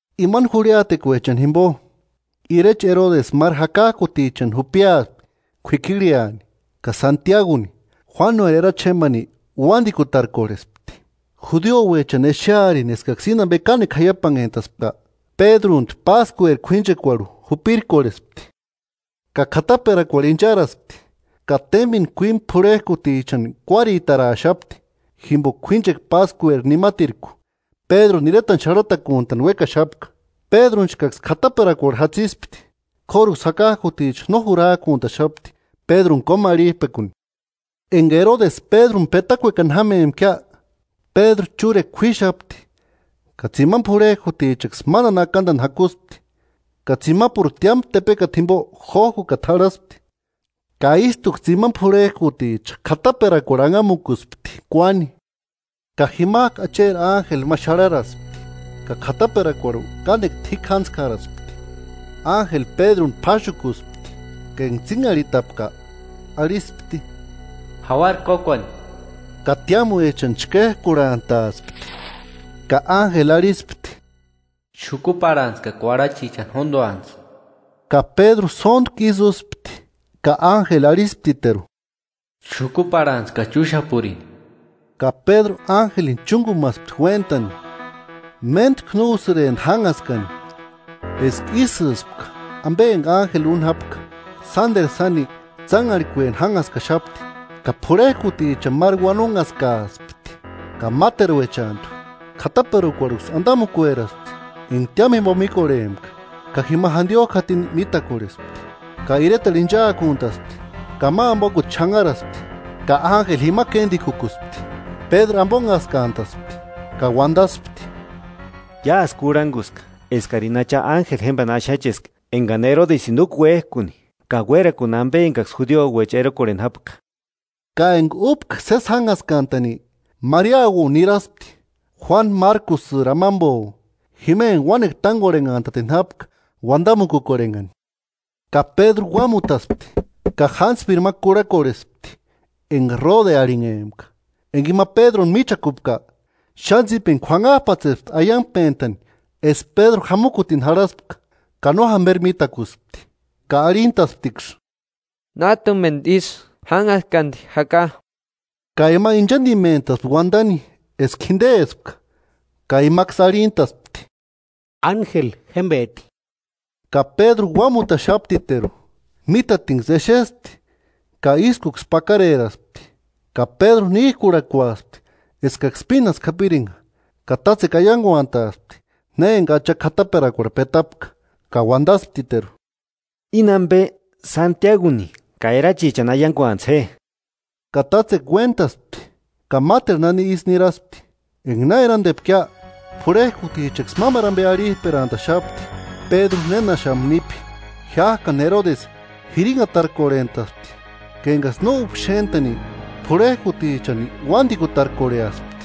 Imani jurhiatekuechani jimbo, irecha Erodesï máru jakajkutichani jupiaspti kuikirhiani. Ka Santiaguni, Juánueri erachi jémbani uandikutarkorhespti. Judiouechani exearini eskaksï íni ambe kánekua jaiapanhentaspka, Pédruntu Páskueri k'uínchekuarhu jupirkorhespti. Ka k'ataperakuarhu incharaspti, ka témbeni k'uímu p'urhejkutichani kuáritaaraxapti, jimboka k'uínchekua Páskueri nimatirku Pédruni iretani xarhatakuntani uékaxapka. Pédrunchkaksï k'ataperakuarhu jatsispti, k'óruksï jakajkuticha no jurajkuntaxapti Pédruni kómarhijpekuni. Enga Erodesi Pédruni petakuekani jámempkia, Pédruni chúrekua k'uíxapti ka tsimani purhejkutichaksï mándani akandani jakuspti, ka tsimapuru tiámu tepekata jimbo jójkukata jarhaspti, ka ístuksï tsimani p'urhejkuticha k'ataperakuarhu anhamukuspti kuáni. Ka jimajku Acheri ánjeli ma xarharaspti ka k'ataperakuarhu kánekua t'íkjantskaraspti. Ánjeli Pédruni p'áxukuspti ka enga tsínharhitapka arhispti: –“Jauara kókuani.” Ka tiámuechani chkéjkurhantaaspti. Ka ánjeli arhispti: “Xukuparhantsï ka kuarhachichani jónduantsï.” Ka Pédru sóntku ísï úspti, ka ánjeli arhisptiteru: “Xukuparhantsï ka chúxapurini.” Ka Pédru ánjelini chúngumaspti uéntani, méntku no úsïrempti jánhaskani eska ísïspka ambe enga ánjeli úni jápka, sánderu sáni tsánharhikueni jánhaskaxapti. Ka p'urhejkutichani máru uanonhaskaaspti ka máteruechantu, k'ataperakuarhuksï andamukueraspti enga tiámu jimbo míkorhempka, ka jima jandiojku jatini mítakorhespti. Ka iretarhu inchaakuntaspti, ka ma ambokuta xanharaspti ka ánjeli jima kéndikukuspti. Pédru ambonhaskantaspti ka uandaspti: “Iásï kurhanguska eskarini Acha ánjelini jémbani axacheska engani Erodesïni úka uéjkuni ka uérakuni ambe engaksï judiuecha erokorheni jápka.” Ka enga úpka sési jánhaskantani Mariauo niraspti, Juánu Márkusïri amambo; jima enga uánekua tángorhenhantatini jápka uandamukukorhenhani. Ka Pédru uámutaspti ka jántspiri ma kurhakorhespti enga Rode arhinhempka, enga ima Pédruni míchakupka, xáni tsípeni k'uanhajpatsespti aiangpentani eska Pédru jamukutini jarhaspka ka no jamberi mítakuspti. Ka arhintasptiksï: –¡Nájtumendu ísï, jánhaskandi jaka! Ka ima inchandimentaspti uandani eska jindespka. Ka imaksï arhintaspti: –Ánjeli jémbeti. Ka Pédru uámutaxaptiteru. Mítatinksï exespti ka ískuksï pakareraspti. Ka Pédru níjkurhakuaspti eskaksï pínasku japiringa, ka tátsekua aianguantaaspti na enga Acha k'ataperakuarhu petapka. Ka uandasptiteru: –Íni ambe Santiaguni ka erachichani aianguantsï je. Ka tátsekua uéntaspti ka máteru nani isï niraspti. Enga na erandepkia, p'urhejkutichaksï mámaru ambe arhijperantaxapti Pédru nénaxamu nípi. Jiájkani Erodesi jirinhatarkorhentaspti ka engaksï no úpka xéntani, p'urhejkutichani uándikutarkorheaspti.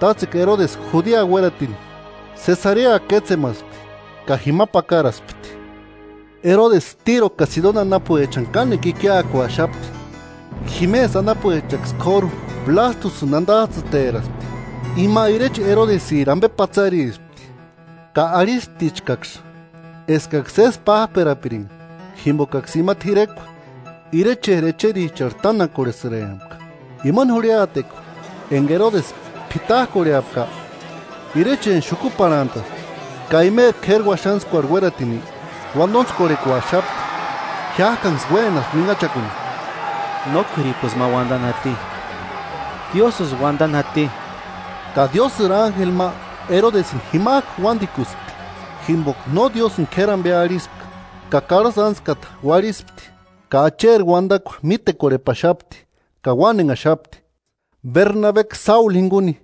Tátsekua Erodesï Judea uératini Sesarea kétsemaspti ka jima pakaraspti. Erodesï Tíro ka Sidoni anapuechani kánekua ikiakuaxapti, jimesï anapuechaksï k'óru Blástusïni andajtsïteraaspti. Ima ireche Erodesïri ambe patsarispti, ka arhisptichkaksï eskaksï sési pájperapiringa jimbokaksï ima t'irekua, irecheri echericharhu tánakorhesïrempka. Imani jurhiatekua enga Erodesï p'itajkorheapka, irecheni xukuparhantaspti ka imeri k'éri uaxantskuarhu uératini uandontskorhekuaxapti. Jiájkaniksï uénaspti uínhachakuni: “¡No k'uiripusï ma uandani jati, Diósïsï uandani jati!” Ka Diósïri ánjeli ma Erodesïni jimajku uándikuspti, jimboka no Diósïni no k'éri ambe arhispka; ka karhasï ántskata uarhispti. Ka Acheri uandakua mítekorhepaxapti ka uánenhaxapti. Bernabeksï Sáulu jinguni,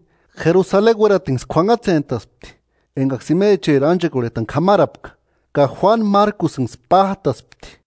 Jerusaleni uératini kuanhatsentaspti engaksï imecheri ánchekorhetani k'amarapka, ka Juánu Márkusïnksï pájtaspti.